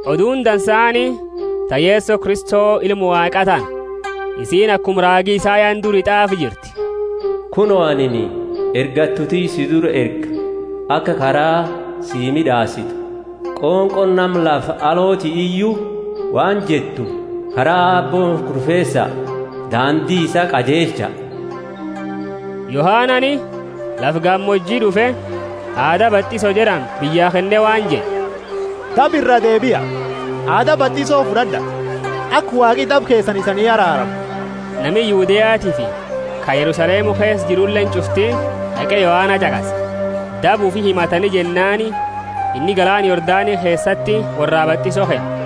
Oduuni Dansaani ta Yeso Kristo Ilma Waaqa tana. Isiini akuma raagi Isayani duri t'aafe jirti: Kuno, anini ergattu tiyya si dura erga, aka kara sii mid'aasitu. Qonqooni nama lafa alooti iyu waan jettu: Kara Aabbo kurfeesa, daandi isaa qajeelcha! Yohanani lafa gamooji d'ufe, aada batiso jed'ani biyya kenne waan jed'e, Daba iraa deebia, aada batiso fud'ad'a, aka Waaqi daba keesani isanii araaramu. Nami Yudeatiifi ka Yerusalemu keesa jiruleeni ch'ufti d'aqe Yohana ch'aqase. Daba ufi himatani jennaani inni galaana Yordani keesati worraa batiso kenne.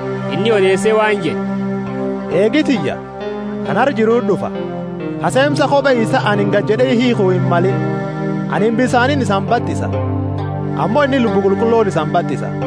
Inni odeese waan jed'e, Eegi tiyya, ka nara jiruti d'ufa, ka seemsa kobe isaa anini gajed'e hiikhu himmalini. Anini bisaaniini isani batisa, ammo inni Lubbu Qulqullooni isani batisa.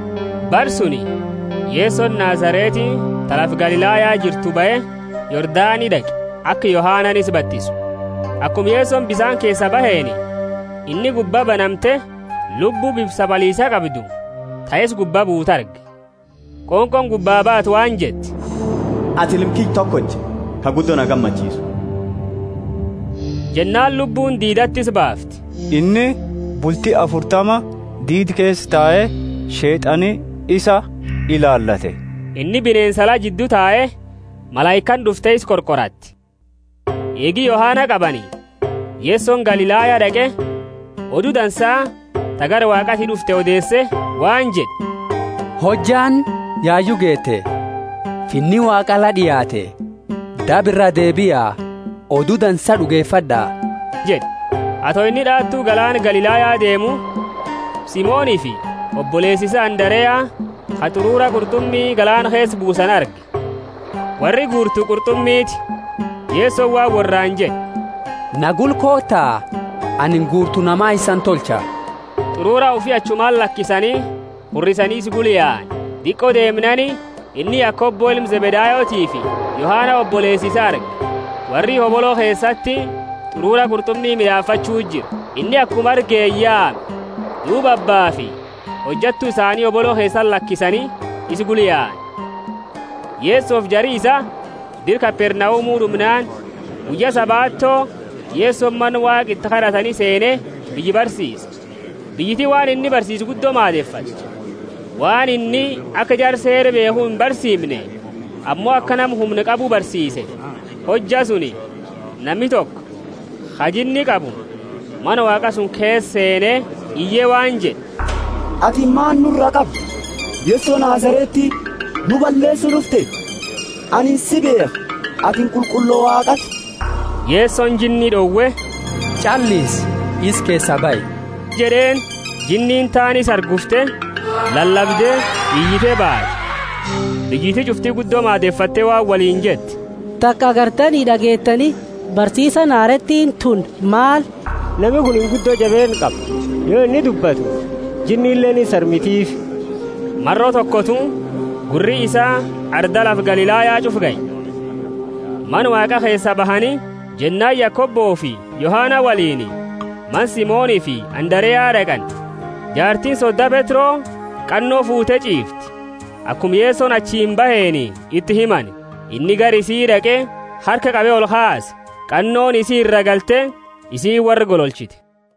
Bara suni Yesoni Nazareti ta lafa Galilaya jirtu bahe, Yordani d'aqe, aka Yohanani isa batisu. Akuma Yesoni bisaani keesaa baheeni, inni gubba banamte, Lubbu bifa sabaliisa qabdu, ta isa gubba buutu, arge. Qonqooni gubba baate waan jette, Atini Ilma kiyya tokocha, ka guddo na gammachiisu. Jennaani Lubbuuni diidati isa baafte. Inni bulti afurtama diida keesa tae, Sheet'ani isa ilaalate. Inni bineensa ala jiddu tae, malaikaani d'ufte isa qorqoratte. Eegi Yohana qabani, Yesoni Galilaya d'aqe, Odu Dansa ta gara Waaqaati d'ufte odeese, waan jed'e, Hojjaani yayu geete, Finni Waaqa la d'iaate, daba iraa deebia, Odu Dansa d'ugefad'a jed'e. Ato inni d'aatu galaana Galilaya deemu, Simonifi oboleesa isaa Andarea, ka t'urura qurt'umi galaana keesa buusani, arge; worri guurtu qurt'umiiti. Yesoni waan worraani jed'e, Na gula koota, anini guurtu nama isani tolcha. T'urura ufi achumati lakisani hurrisani isa gula yaani. Diqo deemnaani, inni Yakobo ilma Zebedayotiifi Yohana oboleesa isaa arge. Worri hobolo keesati t'urura qurt'umi mid'aafachu jira. Inni akuma argeeni yaame, duuba abbaafi hojattu isaani hobolo keesati lakisani isa gula yaani. Yesofi jari isaa dira Kapernaumu d'umnaani, guyya Sabato Yesoni Mana Waaqa iti kad'atani seene biyya barsiise. Biyyiti waan inni barsiise guddo maadefatte, waan inni aka jara Seera beekhu imbarsiimne, ammo aka nama humna qabu barsiiseefi. Hojja suni nami toko ka jinni qabu Mana Waaqa suni keesa seene iye waan jed'e, Atini maani nura qabda, Yeso Nazareti? Nu balleesu d'ufte? Anini si beekha, atini Qulqullo Waaqaati. Yesoni jinni d'owe, Ch'allisi, isa keesaa bahi jed'eeni. Jinniini taani isa hargufte, lalabde, iyite baate. Biyyiti ch'ufti guddo maadefatte waan woliini jette, Taka agartani d'ageetani? Barsiisaani hareetiini tuni maal? Nami kunini guddo jabeenna qaba. Yo inni dubbatu jinnileeni insarmitifi. Maro tokotu gurri isaa arda lafa Galilaya ch'ufa gahe. Mana Waaqa keesaa bahani, jennaani Yakobofi Yohana woliini, mana Simonifi Andarea d'aqani. Jaartiini soda Petro, qanno fuute ch'iifti, akuma Yesoni achiini baheeni iti himani. Inni gara isi d'aqe, harka qabe olkaase. Qannooni isi iraa galte, isiini worra gololchite.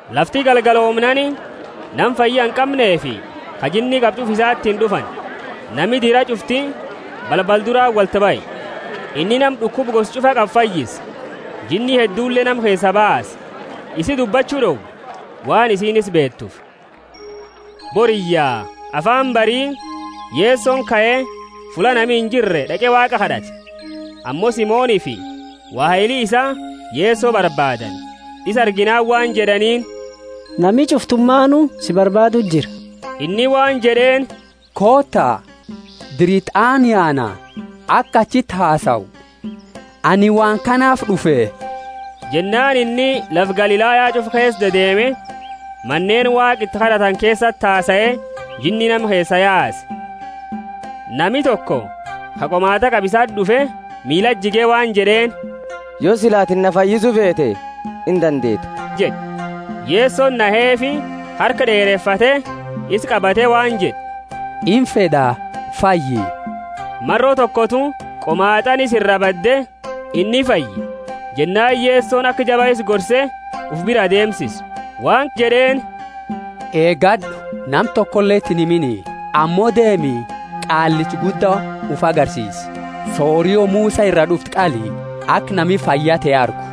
Lafti galgaloomnaani, nama fayya inqamneefi ka jinni qabu ch'ufa isatiini d'ufani. Nami dira ch'ufti balbala durati wolti bahe. Inni nama d'ukuba gosa ch'ufa qabu fayyise, jinni heddule nama keesaa baase, isi dubbachu d'owe, waan isiini isa beetuufi. Boriyya, afaani bari, Yesoni kae, fulla nami injirre d'aqe Waaqa kad'ate. Ammo Simonifi waheli isaa Yeso barbaadani; isa arginaani waan jed'aniini, Nami ch'uftumaani si barbaaduu jira. Inni waan jed'eeni, Koota, dira iti aanu yaana, aka achileti hasau; anini waan kanaafi d'ufe. Jennaani inni lafa Galilaya ch'ufa keesa dedeeme, maneeni Waaqa iti kad'atani keesati hasae, jinni nama keesaa yaase. Nami toko ka qomaat'a qabu isati d'ufe, miilati jige waan jed'eeni, Yo sila atini na fayyisu feete, indandeeta jed'e. Yesoni naheefi, harka d'eerefate, isa qabate waan jed'e, Imfed'a, fayyi. Maro tokotu qomaat'aani isa iraa bade, inni fayye. Jennaani Yesoni aka jaba isa gorse, ufi biraa deemsise, waan jed'eeni, Eegad'u, nama tokoleti inhimini. Ammo deemi, qaallicha gudda ufi agarsiisi, sorio Musa iraa d'ufte qali, aka nami fayya te argu.